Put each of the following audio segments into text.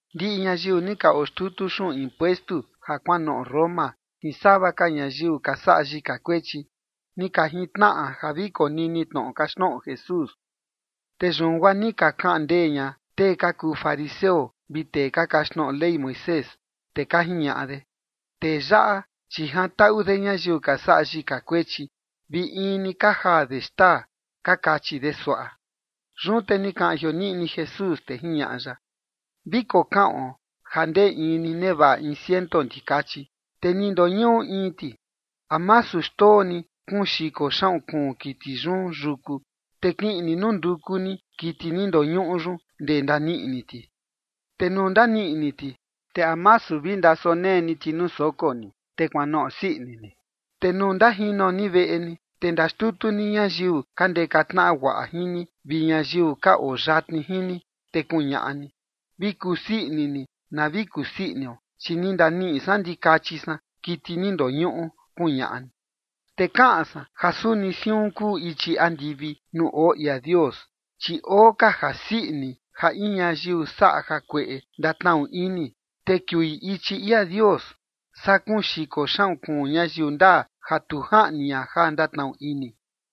Ndiꞌi ñayiu ni ka oxtutu xuꞌun impuestu ja kuanoꞌo Roma jin sava ka ñayiu ka saꞌa yika kuechi, ni ka jintnaꞌa ja vi konini tnoꞌo kaxtnoꞌo Jesús. Te yun guaa ni ka kaꞌan ndee ña tee ka kuu fariseo vi tee ka kaxtnoꞌo Ley Moisés, te ka jiñaꞌa de: ―Tee yaꞌa, chi jantaꞌu de ñayiu ka saꞌa yika kuechi, vi in ni ka jaa de xtaa ―ka kachi de suaꞌa. Yun te ni kaꞌan jioniꞌni Jesús, te jiñaꞌa ya: ―Vi kokaꞌon ja ndee in ni nevaꞌa in ciento ndikachi, te ni ndoñuꞌu in ti. ¿A masu xndoo ni kuun xiko xaꞌun kuun kiti yun yuku, te kiꞌin ni nunduku ni kiti ni ndoñuꞌu yun ndee ndaniꞌi ni ti? Te nuu ndaniꞌi ni ti, te ¿a masu vi ndasonee ni ti nuu soko ni, te kuanoꞌo sii ini ni? Te nuu ndajino ni veꞌe ni, te ndaxtutu ni ñayiu ka ndeka tnaꞌa guaꞌa jin ni vi ñayiu ka oo yatni jin ni, te kuñaꞌa ni: “Vi kusii ini ni na vi kusii inio, chi ni ndaniꞌi san ndikachi san kiti ni ndoñuꞌu”, kuñaꞌa ni. Te kaꞌan san ja suni siun kuu ichi andivi nuu oo ia Dios, chi oo ka jasii ini ja in ñayiu saꞌa jakueꞌe ndatnaꞌu ini, te kiui ichi ia Dios, saa kuun xiko xaꞌun kuun ñayiu ndaa ja tu jaꞌni ña ja ndatnaꞌu ini.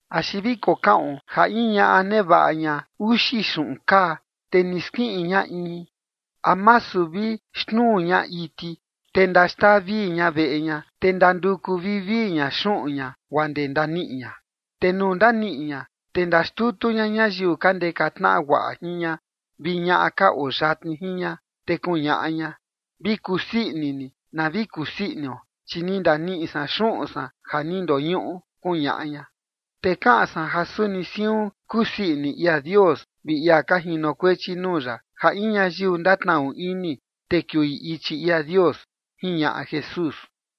’Axi vi kokaꞌon ja in ñaꞌa nevaꞌa ña uxi xuꞌun kaa, te ni skiꞌin ña in, ¿a masu vi xnuu ña iti, te ndaxtaa vii ña veꞌe ña, te ndanduku vivii ña xuꞌun ña guaa ndee ndaniꞌi ña? Te nuu ndaniꞌi ña, te ndaxtutu ña ñayiu ka ndeka tnaꞌa guaꞌa jin ña vi ñaꞌa ka oo yatni jin ña, te kuñaꞌa ña: “Vi kusii ini ni na vi kusii inio, chi ni ndaniꞌi san xuꞌun san ja ni ndoñuꞌu”, kuñaꞌa ña. Te kaꞌan san ja suni siun kusii ini ia Dios vi ia ka jinokuechi nuu ya ja in ñayiu ndatnaꞌu ini, te kiui ichi ia Dios ―jiñaꞌa Jesús.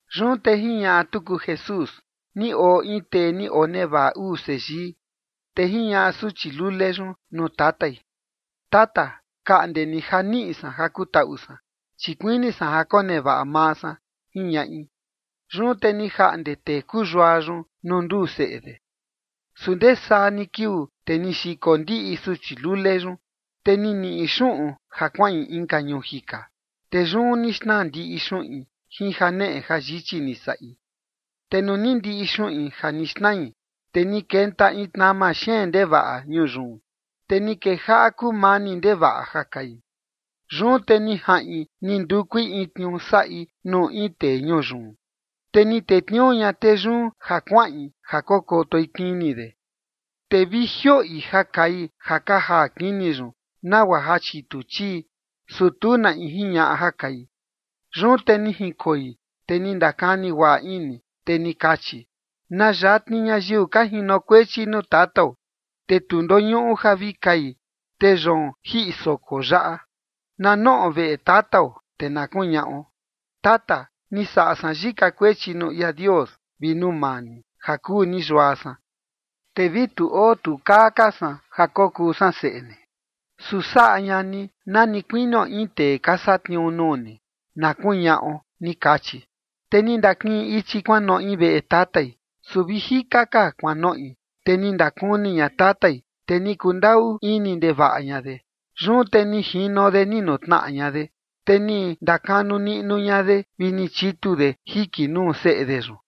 Yun te jiñaꞌa tuku Jesús: ―Ni oo in tee ni onevaꞌa uu seyii. Te jiñaꞌa suchi lule yun nuu tatai: “Tata, kaꞌnde ni ja niꞌi san ja kutaꞌu san, chi kuini san ja konevaꞌa maa san”, jiñaꞌi. Yun te ni jaꞌnde tee kuu yua yun nuu nduu seꞌe de. Su ndee saa ni kiuu, te ni xiko ndiꞌi suchi lule yun, te ni niꞌi xuꞌun ja kuaꞌin inka ñuu jika, te yun ni xnaa ndiꞌi xuꞌin jin janeꞌe jayichi ni saꞌi. Te nuu ni ndiꞌi xuꞌin ja ni xnai, te ni kenta in tnama xeen ndevaꞌa ñuu yun. Te ni kejaꞌa kumani ndevaꞌa ja kai. ’Yun te ni jaꞌin ni ndukui in tniuu saꞌi nuu in tee ñuu yun. Te ni tetniuu ña tee yun ja kuaꞌin ja kokotoi kini de. Te vi jioꞌi ja kai ja ka jaa kini yun nagua ja chitu chii, su tu na in jiñaꞌa ja kai. Yun te ni jinkoi, te ni ndakani guaꞌa ini, te ni kachi: “Na yatni ñayiu ka jinokuechi nuu tatao, te tu ndoñuꞌu ja vi kai, te yoon jiꞌi soko yaꞌa. Na noꞌo veꞌe tatao, te na kuñaꞌo: Tata, ni saꞌa san yika kuechi nuu ia Dios vi nuu maa ni, ja kuu ni yua san. Te vi tu oo tu kaa ka san ja kokuu san seꞌe ni. Su saꞌa ña ni na ni kuinio in tee ka satniuu nuu ni, na kuñaꞌo”, ni kachi. ’Te ni ndakiꞌin ichi kuanoꞌi veꞌe tatai, su vi jika ka kuanoꞌi, te ni ndakuni ña tatai, te ni kundaꞌu ini ndevaꞌa ña de. Yun te ni jino de ni nutnaꞌa ña de, te ni ndakanu niꞌnu ña de vi ni chitu de jiki nuu seꞌe de yun.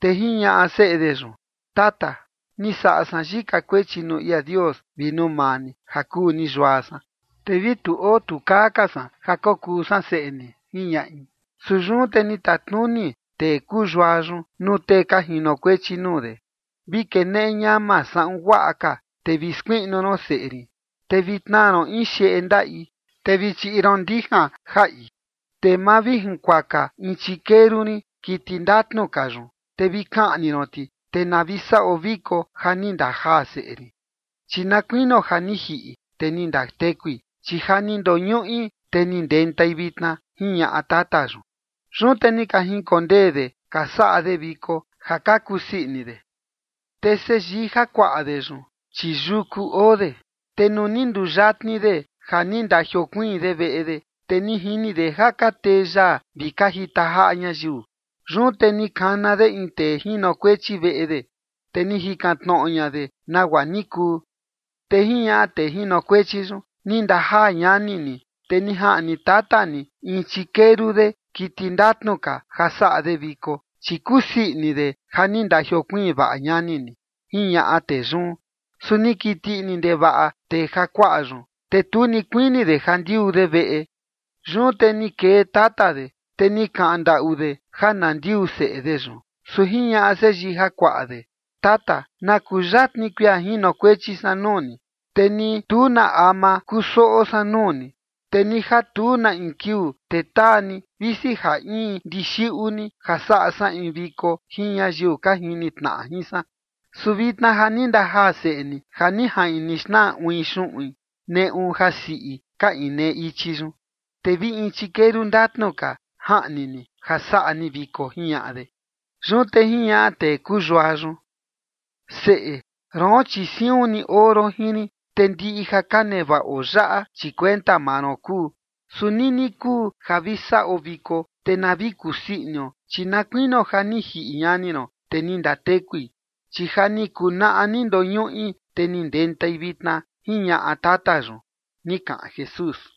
Te jiñaꞌa seꞌe de yun: “Tata, ni saꞌa san yika kuechi nuu ia Dios vi nuu maa ni, ja kuu ni yua san. Te vi tu oo tu kaa ka san ja kokuu san seꞌe ni”, jiñaꞌi. Su yun te ni tatnuni tee kuu yua yun nuu tee ka jinokuechi nuu de: “Vi keneꞌe ñama saꞌun guaꞌa ka, te vi skuiꞌnu ron seꞌe rin, te vi tnaa ron in xeꞌe ndaꞌi, te vi chiꞌi ron ndijan jaꞌi. Te mavijinkuaka in chikeru rin, kiti ndatnu ka yun, te vi kaꞌni ron ti, te na vi saꞌo viko ja ni ndajaa seꞌe rin. Chi na kuinio ja ni jiꞌi, te ni ndatekui, chi ja ni ndoñuꞌi, te ni ndentai vitna”, jiñaꞌa tata yun. Yun te ni ka jinkondee de ka saꞌa de viko ja ka kusii ini de. ’Te seyii jakuaꞌa de yun, chi yuku oo de. Te nuu ni nduyatni de ja ni ndajiokuiin de veꞌe de, te ni jini de ja ka tee yaa vi ka jita jaꞌa ñayiu. Yun te ni kana de in tee jinokuechi veꞌe de, te ni jikan tnoꞌo ña de nagua ni kuu. Te jiñaꞌa tee jinokuechi yun: “Ni ndajaa ñani ni, te ni jaꞌni tata ni in chikeru de, kiti ndatnu ka, ja saꞌa de viko, chi kusii ini de ja ni ndajiokuiin vaꞌa ñani ni”, jiñaꞌa tee yun. Su ni kiti ini ndevaꞌa tee jakuaꞌa yun, te tu ni kuini de ja ndiuu de veꞌe. Yun te ni kee tata de, te ni kaꞌan ndaꞌu de ja na ndiuu seꞌe de yun. Su jiñaꞌa seyii jakuaꞌa de: “Tata, na kuyatni kuia jinokuechi san nuu ni, te ni tu na ama kusoꞌo san nuu ni. Te ni ja tu na in kiuu, te taa ni vi sija in ndixiꞌu ni ja saꞌa san in viko jin ñayiu ka jini tnaꞌa jin san. Su vitna ja ni ndajaa seꞌe ni ja ni jaꞌin ni xnaa uin xuꞌun neꞌu jasiꞌi ka inee ichi yun, te vi in chikeru ndatnu ka jaꞌni ni ja saꞌa ni viko”, jiñaꞌa de. Yun te jiñaꞌa tee kuu yua yun: “Seꞌe, roon, chi siun ni oo ron jin rin, te ndiꞌi ja ka nevaꞌo yaꞌa, chi kuenta maa ron kuu. Su nini kuu ja vi saꞌo viko, te na vi kusii inio, chi na kuinio ja ni jiꞌi ñani ron, te ni ndatekui, chi ja ni kuu naꞌa ni ndoñuꞌi, te ni ndentai vitna”, jiñaꞌa tata yun ―ni kaꞌan Jesús.